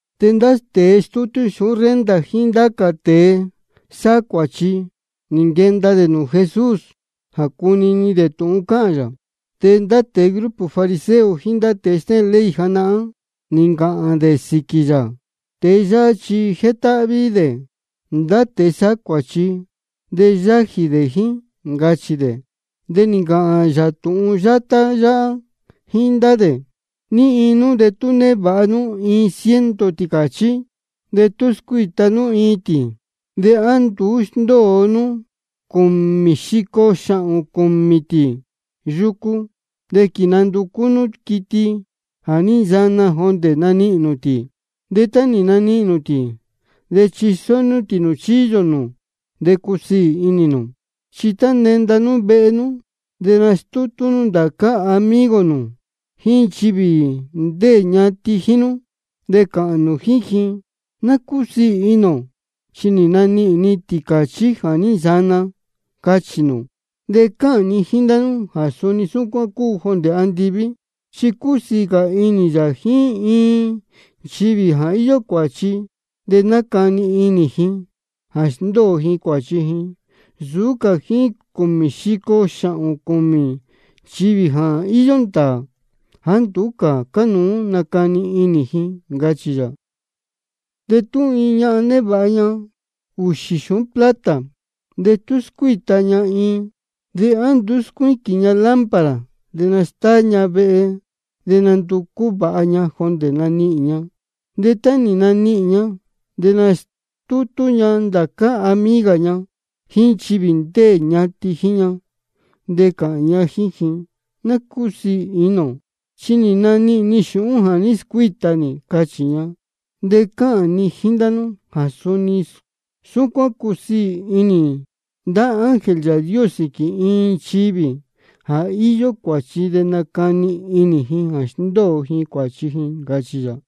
De ndá tēe stútú xūhún renta jíín ndá cā tēe sáhá cuāchi, nī nquenda dē nūū Jesús jā cunini dē tūhun cáhān yā. De ndá tēe grupo fariseo jíín ndá tēe stéhēn ley janahán, nī ncāhān dē sīquī yā: Tēe yáhá chi jétáhví dē ndá tēe sáhá cuāchi de yájī dē jíín, ncachī dē. De nī ncāhān yā tūhun yátá yáhá jíín ndá dē: ¿Ní iin nú de tú névāha nú iin ciento tīcāchí, de tú scuíta nú iin tī, de á nduú sndóo nú cūmī xico xāhōn cūmī cā tī yucu, de quīnanducú nú quiti jā ní nsana jondē nanihīn nū tī? De tá nī nanihīn nū tī, de chisó nú tī nūū chíyō nū, de cusiī inī nū. De tá nenda nú vehe nú de nastútú nú ndācá amigo nū jíín nchivī ndéē ñatin jíín nú, de cāhān nū jíín ji: Ná cúsiī inī ō, chi nī nanihīn ni tīcāchí nī jā ní nsana, cachī nū. De cáhān ni jíín ndá nú jā suni súcuán cúu jondē andiví. Chi cúsiī cā inī yā jíín iin nchivī jā íyó cuāchi de nácani inī ji jā sndóo ji cuāchi ji, nsūú cā jíín cūmī xico xāhōn cūmī nchivī íyó ndāā jāá nduú cā cánuú nacani inī ji, ncachī yā. De tú iin ñahan névāha ña ūxī xūhún plata, de tú scuíta ña iin, ¿de á nduú scuíquīn ña lámpara, de nastáá ña vehe, de nanducú vāha ña jondē nanihīn ña? De tá nī nanihīn ña, de nastútú ña ndācá amiga ña jíín nchivī ndéē ñatin jíín ña, de cāhān ña jíín ji: Ná cúsiī inī ō, chi nī nanihīn ni xūhún jā ní scuíta nī, cachī ña. De cáhān ni jíín ndá nú jā suni súcuán cúsiī inī ndá ángel Yāā Dios sīquī iin nchivī jā íyó cuāchi de nácani inī ji jā sndóo ji cuāchi ji, ncachī yā.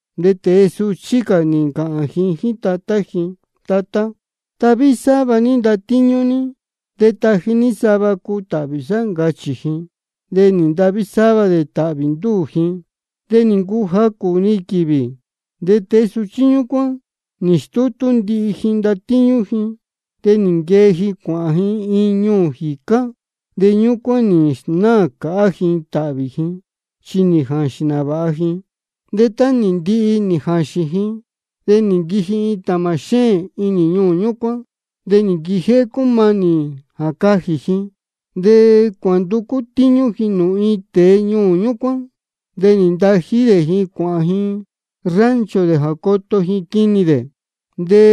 De tēe suchí cā nī ncāhān ji jíín tatá ji: Tatá, tahví sáva ní ndatíñú ní, de taji ní sava cuu tāhvī sá, ncachī ji. De nī ntahví sáva dē tāhvī ndúū ji. De nī ncuu jacū-ni quīvī, de tēe suchí ñúcuán nī stútú ndihi ji ndatíñú ji, de nī nquee ji cuāhān ji iin ñuū jīcá. De ñúcuán nī snáā cāhá ji tāhvī ji chi nī jāxīn nāvāha ji. De tá nī ndihi nī jāxīn ji, de nī nquiji iin tāmā xéēn inī ñuū ñúcuán, de nī nquijéhé cúmanī jā cajī ji. De cuānducú tíñú ji nūū iin tēe ñuū ñúcuán. De nī ntají dē ji cuāhān ji rancho dē jā coto ji quinī dē. De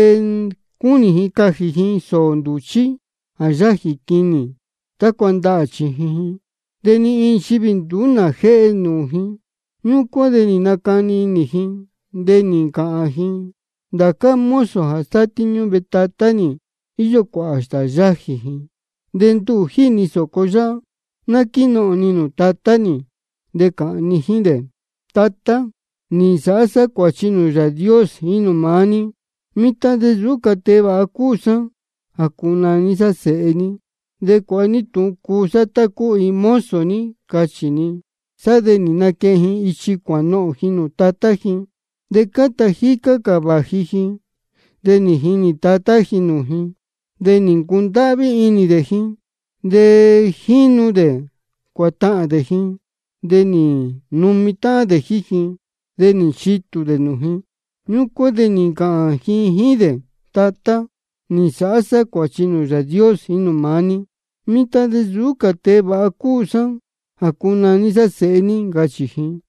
cúnī ji cajī ji sōō ndūchí jā yájī quinī tácua ndahā chījin ji. De ni iin nchivī nduú ná jéhe nūū ji. Ñúcuán de nī nacani inī ji, de nī ncāhān ji: Ndācá mozo jā sátíñú vehe tatá nī, íyó cuāhā stāā yájī ji. De nduhū jíhī ni sōco yáhá. Ná quínohōn ni nūū tatá nī, de cāhān ni jíín dē: Tatá, nī nsāhá sá cuāchi nūū Yāā Dios jíín nūū maá ní. Mitan de nsūú cā tēe vāha cúu sá jā cunaní sá sēhe ní. De cuāha ní tūhun cuu sá tá cúu iin mozo ní, cachī ni. Sá de nī naquehen ji ichi cuānohōn ji nūū tatá ji. De cáta jícá cā vāji ji, de nī jinī tatá ji nūū ji, de nī ncundáhví inī dē ji. De jínu dē cuātahān dē ji, de nī numi táhán dē jíín ji, de nī nchitū dē nūū ji. Ñúcuán de nī ncāhān ji jíín dē: Tatá, nī nsāhá sá cuāchi nūū Yāā Dios jíín nūū maá ní. Mitan de nsūú cā tēe vāha cúu sá jā cunaní sá sēhe ní, ncachī ji.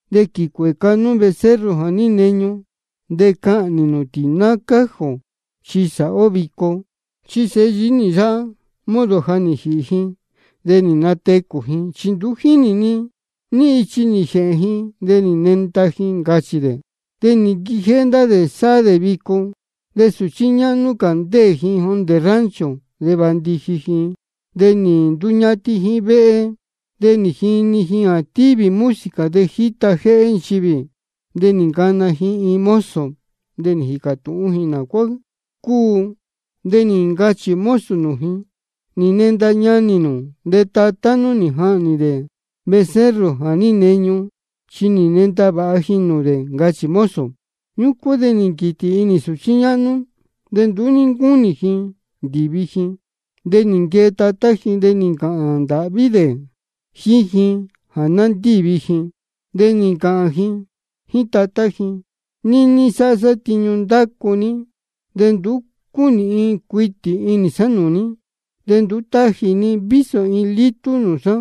De quīcuēca nú becerro jā ní neñu, de cahnī nū tī ná cájī ō, chi sāhá ó vico. Chi sēhe yií nī yáhá, modo ja nī jīhī ji, de nī natecū ji. Chi nduú ní jínī ni ní ichi nī jēhēn ji, de nī nenda ji, ncachī dē. De nī nquijéhé ndá dē sáhá dē vico. De sūchí ñáhnú cā, ndéē ji jondē rancho, de vāndiji ji, de nī nduñatin ji vehe. De nī jini ji jā tívī música de jíta jéhé nchivī. De nī ncana ji iin mozo, de nī jīcā tūhún ji nā cuá cúu. De nī ncachī mozo nūū ji: Nī nenda ñanī nū, de tatá nú nī jahnī dē becerro jā ní neñu, chi nī nenda vāha ji nūū dē, ncachī mozo. Ñúcuán de nī nquītī inī sūchí ñáhnú, de nduú ní ncúnī ji ndīvi ji. De nī nquee tatá ji, de nī ncāhān ndāhví dē jíín ji jā ná ndívi ji. De nī ncāhān ji jíín tatá ji: Níní sáhá sá tiñu ndácu ní, de nduú cúnīhin cuitī inī sá nūū ní. De nduú táji ní vísō iin lítú nūū sá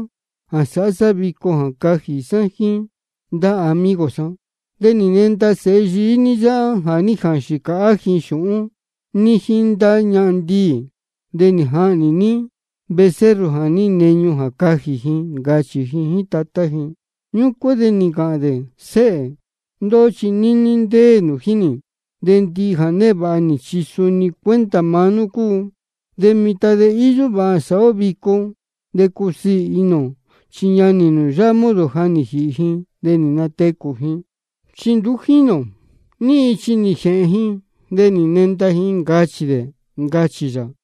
jā sāhá sá vico jā cajī sá jíín ndá amigo sá. De nī nenda sēhe ní yáhá jā ní jāxīn cāhá ji xūhún ní jíín ndá ñahan ndiī. De nī jahnī ní becerro jā ní neñu jā cajī ji, ncachī ji jíín tatá ji. Ñúcuán de nī ncāhān dē: Séhē, ndóhó chi níní ndéē nū jíín nī, de ndihi jā névāha nī chi suni cuenta maá nú cúu. De mitan de íyó vāha jā sāhá ó vico de cusiī inī ō. Chi ñanī nū yáhá, modo ja nī jīhī ji, de nī natecū ji. Chi nduú ní jínī ō ní ichi nī jēhēn ji, de nī nenda ji, ncachī dē, ncachī yā.